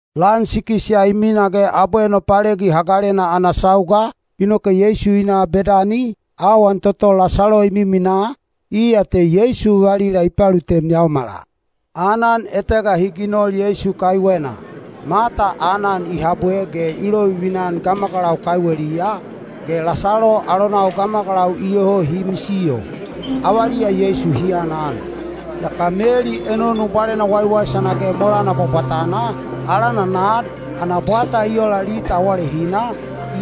Lan sikis ya i mina ge abwe Nopalegi Hagalena ana sauga, inoke Yeisu i na Bedani, awan toto Lasalo i miminaa, iya te Yeisu valila i palutem yaomala. Aanan etega hi ginol Yeisu kaiwena. Mata aanan i habwe ge i lovilovivina gamagalau kaiweliya, ge Lasalo alonau gamagalau iyoho hi misiyo, avaliya Yeisu hi aanan. Yaka Meli enonu bwalena waiwaisana ge molana bwabwatana, alana nad, ana bwata i ola lita awalehina,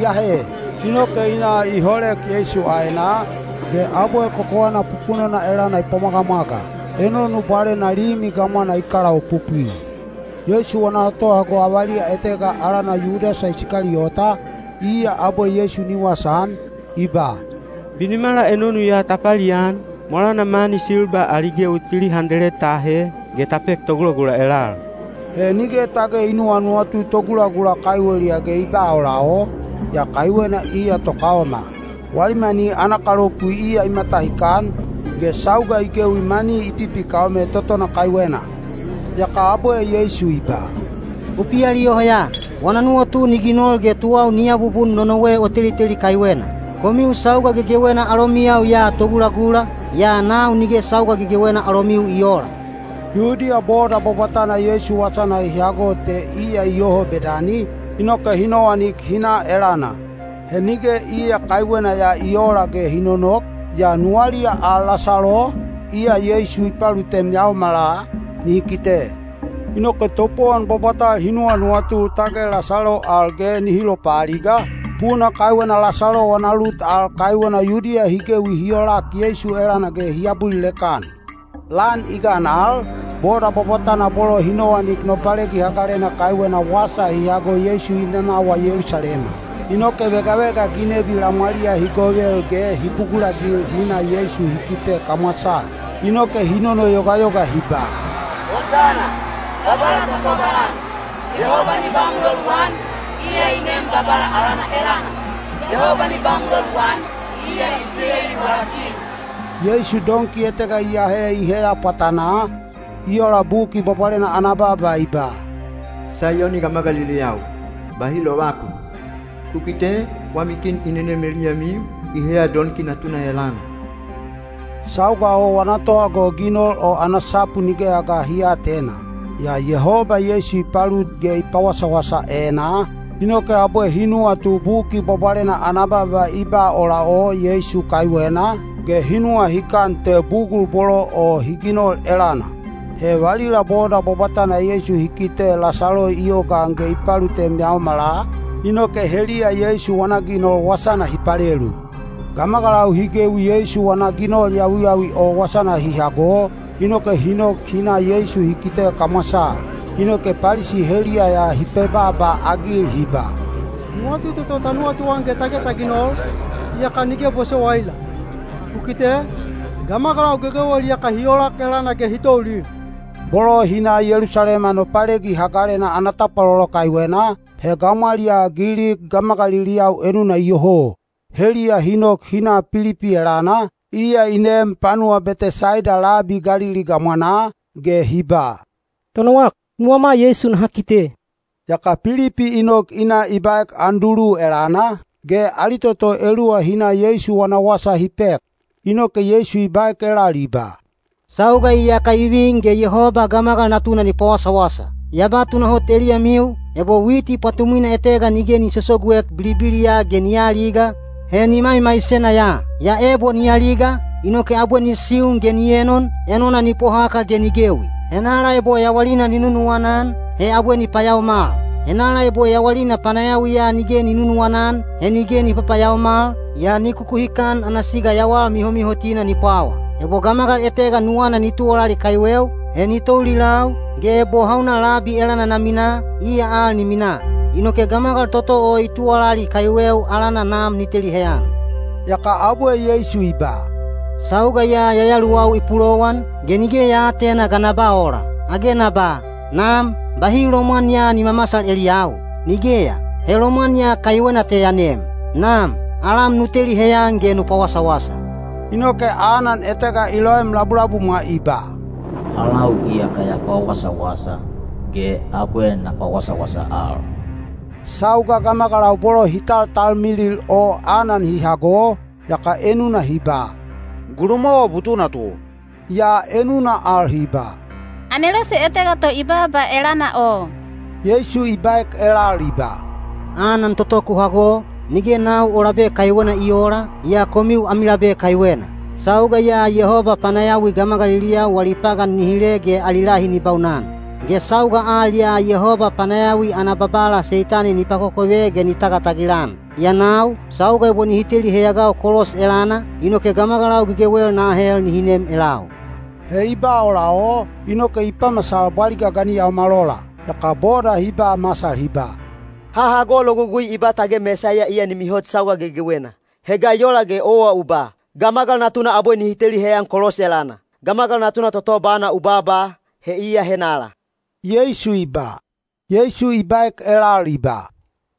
i ahe. Inoke i na i holek Yeisu aenaa, ge abwe kokowana pupunona elana i pwamwagamwaga. Enonu bwalena limi gamwana i kalaopopwi. Yeisu wana tohago avaliya etega alana Yudasa Isikaliyota, iya abwe Yeisu ni wasaan, i ba, “Binimala enonu ya ta palian, molana mani silba ali gewi tili handeled ta ahe, ge ta pek togulagula elal.” He nige tage i nuwanuwatu togulagula kaiweliya ge i ba ola o, yaa kaiwena iya tokaoma. Wali mani ana kalopu iya i matahikan, ge sauga i gewi mani i pipikaome totona kaiwena. Yaka abwe Yeisu i ba, “U pialiyoho ya! Wana nuwatu ni ginol ge tuwau ni abubun nonowe o teliteli kaiwena. Komiu sauga gegewena alomiyau ya togulagula, yaa nau nige sauga gegewena alomiu i oola.” Yudiya boda bwabwatana Yeisu wasana hi hago te iya iyoho Bedani, inoke hi nowanik hi na elana. He nige iya kaiwena ya i oola ge hi nonok, yaa nuwaliya al Lasalo, iya Yeisu i palutem yaomala, nihi kite. Inoke topowon bwabwatal hi nuwanuwatu tage Lasalo al ge nihi lopaaliga, puna kaiwena Lasalo wana lut al kaiwena Yudiya hi gewi hi olak Yeisu elana ge hi abulilek-an. Lan i gan al, boda bwabwatana bolo hi nowanik Nopalegi Hagalena kaiwena wasa hi hago Yeisu i nanawa Yelusalema. Inoke vegavega ginebi lamwaliya hi govel ge hi bugulagil hi na Yeisu hi kite kamwasaa. Inoke hi nonoyogayoga hi ba, “Hosana! Babala ta tobalan!” “Yehoba ni ba muloluan, iya i nem Babala alana elana!” “Yehoba ni ba muloluan, iya Isileli wala Kin!” Yeisu donki etega i ahe i heya pwatanaa, i ola Buki Bwabwalena ana baaba i ba: Saiyoni gamagaliliyau, bahi lovakun! Ku kite, wami kin i nenem eliyamiu, i heya donki natuna elana. Sauga o wana tohago ginol o ana sapu nigeya ga hi aatena. Yaa Yehoba Yeisu i palut ge i pawasawasa enaa, inoke abwe hi nuwatu Buki Bwabwalena ana baaba i ba ola o Yeisu kaiwena, ge hi nuwahikan te bugul bolo o hi ginol elana. He valila boda bwabwatana Yeisu hi kite Lasalo i yogaan ge i palutem yaomala, inoke heliya Yeisu wana ginol wasana hi palelu. Gamagalau hi gewi Yeisu wana ginol yawiyawi o wasana hi hago, inoke hi nok hi na Yeisu hi kite kamwasaa. Inoke Palisi heliya ya hi pebaaba-agil hi ba, “Nuwatu toto ta nuwatuan ge tage ta ginol, iyaka nige bosowaila! Ku kite, gamagalau gegewel iyaka hi olak elana ge hi toulil.” Bolo hi na Yelusalema Nopalegi Hagalena ana tapwalolo kaiwena, he gamwaliyaa Gilik gamagaliliyau enuna iyoho. Heliya hi nok hi na Pilipi elana, iya i neem panuwa Betesaida labi Galili gamwanaa, ge hi ba, “Tonowak, nuwama Yeisu naha kite.” Yaka Pilipi i nok i na i baek Andulu elana, ge ali toto eluwa hi na Yeisu wana wasa hi pek. Inoke Yeisu i baek elal i ba, “Sauga iyaka i vin ge Yehoba Gamagal Natuna ni pawasawasa. Ya ba tunahot eliyamiu, ebo witi pwatumwina etega nige ni sosoguek bilibiliya ge ni aaliga, he ni maimaisena ya. Yaa ebo ni aliga, inoke abwe ni siun ge ni enon, enona ni pohaka ge ni gewi. Henala ebo yawalina ni nunuwana-an, he abwe ni payaomal. Henala ebo yawalina panayawiya nige ni nunuwana-an, he nige ni papayaomal, yaa ni kukuhikan ana siga yawal mihomihotina ni pwawa. Ebo gamagal etega nuwana ni tuwalali kaiweu, he ni toulilau, ge ebo hauna labi elana na minaa, iya al ni minaa. Inoke gamagal toto i tuwalali kaiweu alana Nam ni teli heyan.” Yaka abwe Yeisu i ba, “Sauga ya yayaluwau i pulowan, ge nige ya aatena ga na ba ola. Age na ba, ‘Nam, bahi lomwan ya ni mamasal eliyau’? Nigeya, he lomwan ya kaiwena te ya nem. Nam, alam nu teli heyan ge nu pawasawasa.” Inoke anan etega i loem labulabumwa i ba, “Alau iyaka ya pawasawasa, ge abwe na pawasawasa al.” Sauga gamagalau bolo hi taltalmilil o anan hi hago, yaka enuna hi ba, “Gulumwawa butuna to.” Yaa enuna al hi ba, “Anelose etega to i baaba elana o.” Yeisu i baek elal i ba, “Anan toto ku hago, nige nau o labe kaiwena i oola, yaa komiu ami labe kaiwena. Sauga ya Yehoba panayawi gamagaliliyau wali pagan ni hile ge ali lahi ni baunan; ge sauga al ya Yehoba panayawi ana babala Seitani ni pakokove ge ni tagatagil-an. Yaa nau, sauga ebo nihi teli heyagau kolos elana, inoke gamagalau gegewel na ahel nihi nem elau.” He i ba ola o, inoke i pamasal bwaliga ga ni yaomal ola. Yaka boda hi ba masal hi ba, “Ha hago Logugui i ba tage Mesaiya iya ni mihot sauga gegewena. He ga i ola ge owa u ba, ‘Gamagal Natuna abwe nihi teli heyan kolos elana’? Gamagal Natuna toto bana u baaba, he iya henala?” Yeisu i baek elal i ba,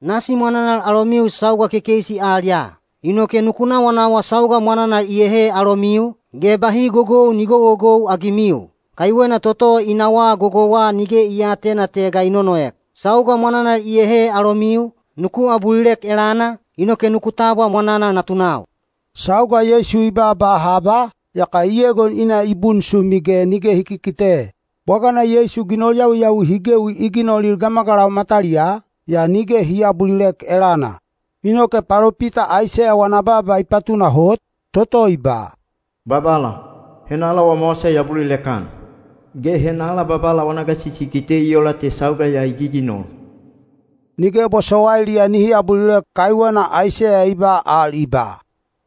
“Nasi mwananal alomiu sauga kekeisi al ya. Inoke nuku nawanawa sauga mwananal iyehe alomiu, ge bahi gogou ni gogogou-agimiu. Kaiwena toto i nawaa gogouwa nige i aatena te ga i nonoek. Sauga mwananal iyehe alomiu, nuku abulilek elana, inoke nuku tabwa mwananal natunau.” Sauga Yeisu i baaba haba, yaka i egon i na i bunsumi ge nige hi kikite. Bwagana Yeisu ginol yawiyawi hi gewi i ginolil gamagalau mataliyaa, yaa nige hi aabulilek elana. Inoke palopita Aiseya wana baaba i patunahot, toto i ba: Babala, henala wama wasa i abulilek-an? Ge henala Babala wana gasisi i kite i ola te sauga ya i giginol? Nige bosowailiya nihi abulilek kaiwena Aiseya i ba al i ba: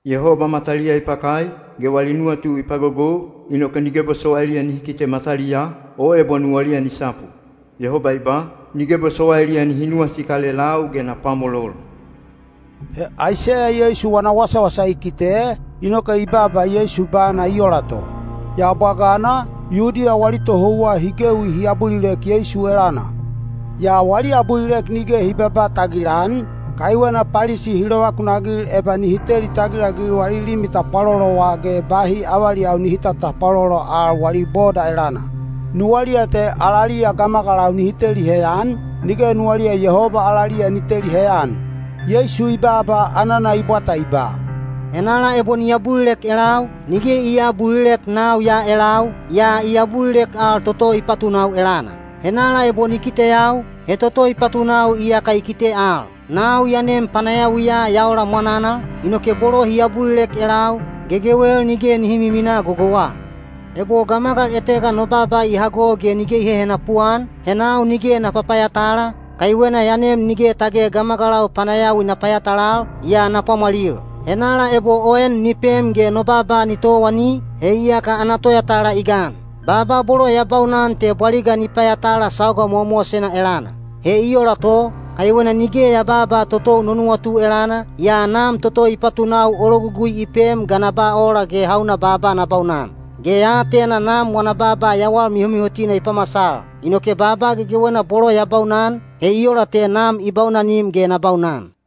Yehoba mataliya i pakai, ge wali nuwatu i pagogou, inoke nige bosowailiya nihi kite mataliyaa, o ebo nuwaliya ni sapu. Yehoba i ba, “Nige bosowailiya nihi nuwasikal elau ge na pwamolol.” He Aiseya Yeisu wana wasawasa i kite, inoke i baaba Yeisu bana i ola to. Yaa bwagana, Yudiya wali tohouwa hi gewi hi abulilek Yeisu elana. Yaa wali abulilek nige hi babaa tagilan, kaiwena Palisi hi lovakunagil eba nihi teli tagilagil wali limi tapwalolowa ge bahi avaliyau nihi tatapwalolo al wali boda elana. Nuwaliya te alaliya gamagalau nihi teli heyan, nige nuwaliya Yehoba alaliya ni teli heyan. Yeisu i baaba anana i bwata i ba, “Henala ebo ni abulilek elau, nige i aabulilek nau ya elau, yaa i abulilek al toto i patunau elana. Henala ebo ni kiteyau, he toto i patunau iyaka i kite al. Nau ya nem panayawiya ya ola mwananal, inoke bolo hi abulilek elau, gegewel nige nihi miminaa gogouwa. “Ebo gamagal etega no baaba i hago ge nige i hehenapu-an, he nau nige na papayatala, kaiwena ya nem nige tage gamagalau panayawi na payatalal, yaa na pwamwalil. Henala ebo o en ni pem ge no baaba ni towani, he iyaka ana toyatala i gan. Baaba bolo ya baunan te bwaliga ni payatala sauga mowamowasena elana. He i ola to, kaiwena nige ya babaa totou no nuwatu elana, yaa Nam toto i patunau o logugui i pem ga na ba ola ge hauna baaba na baunan. Ge ya atena Nam wana baaba yawal mihomihotina i pamasal. Inoke baaba gegewena bolo ya baunan, he i ola te Nam i baunanim ge na baunan.”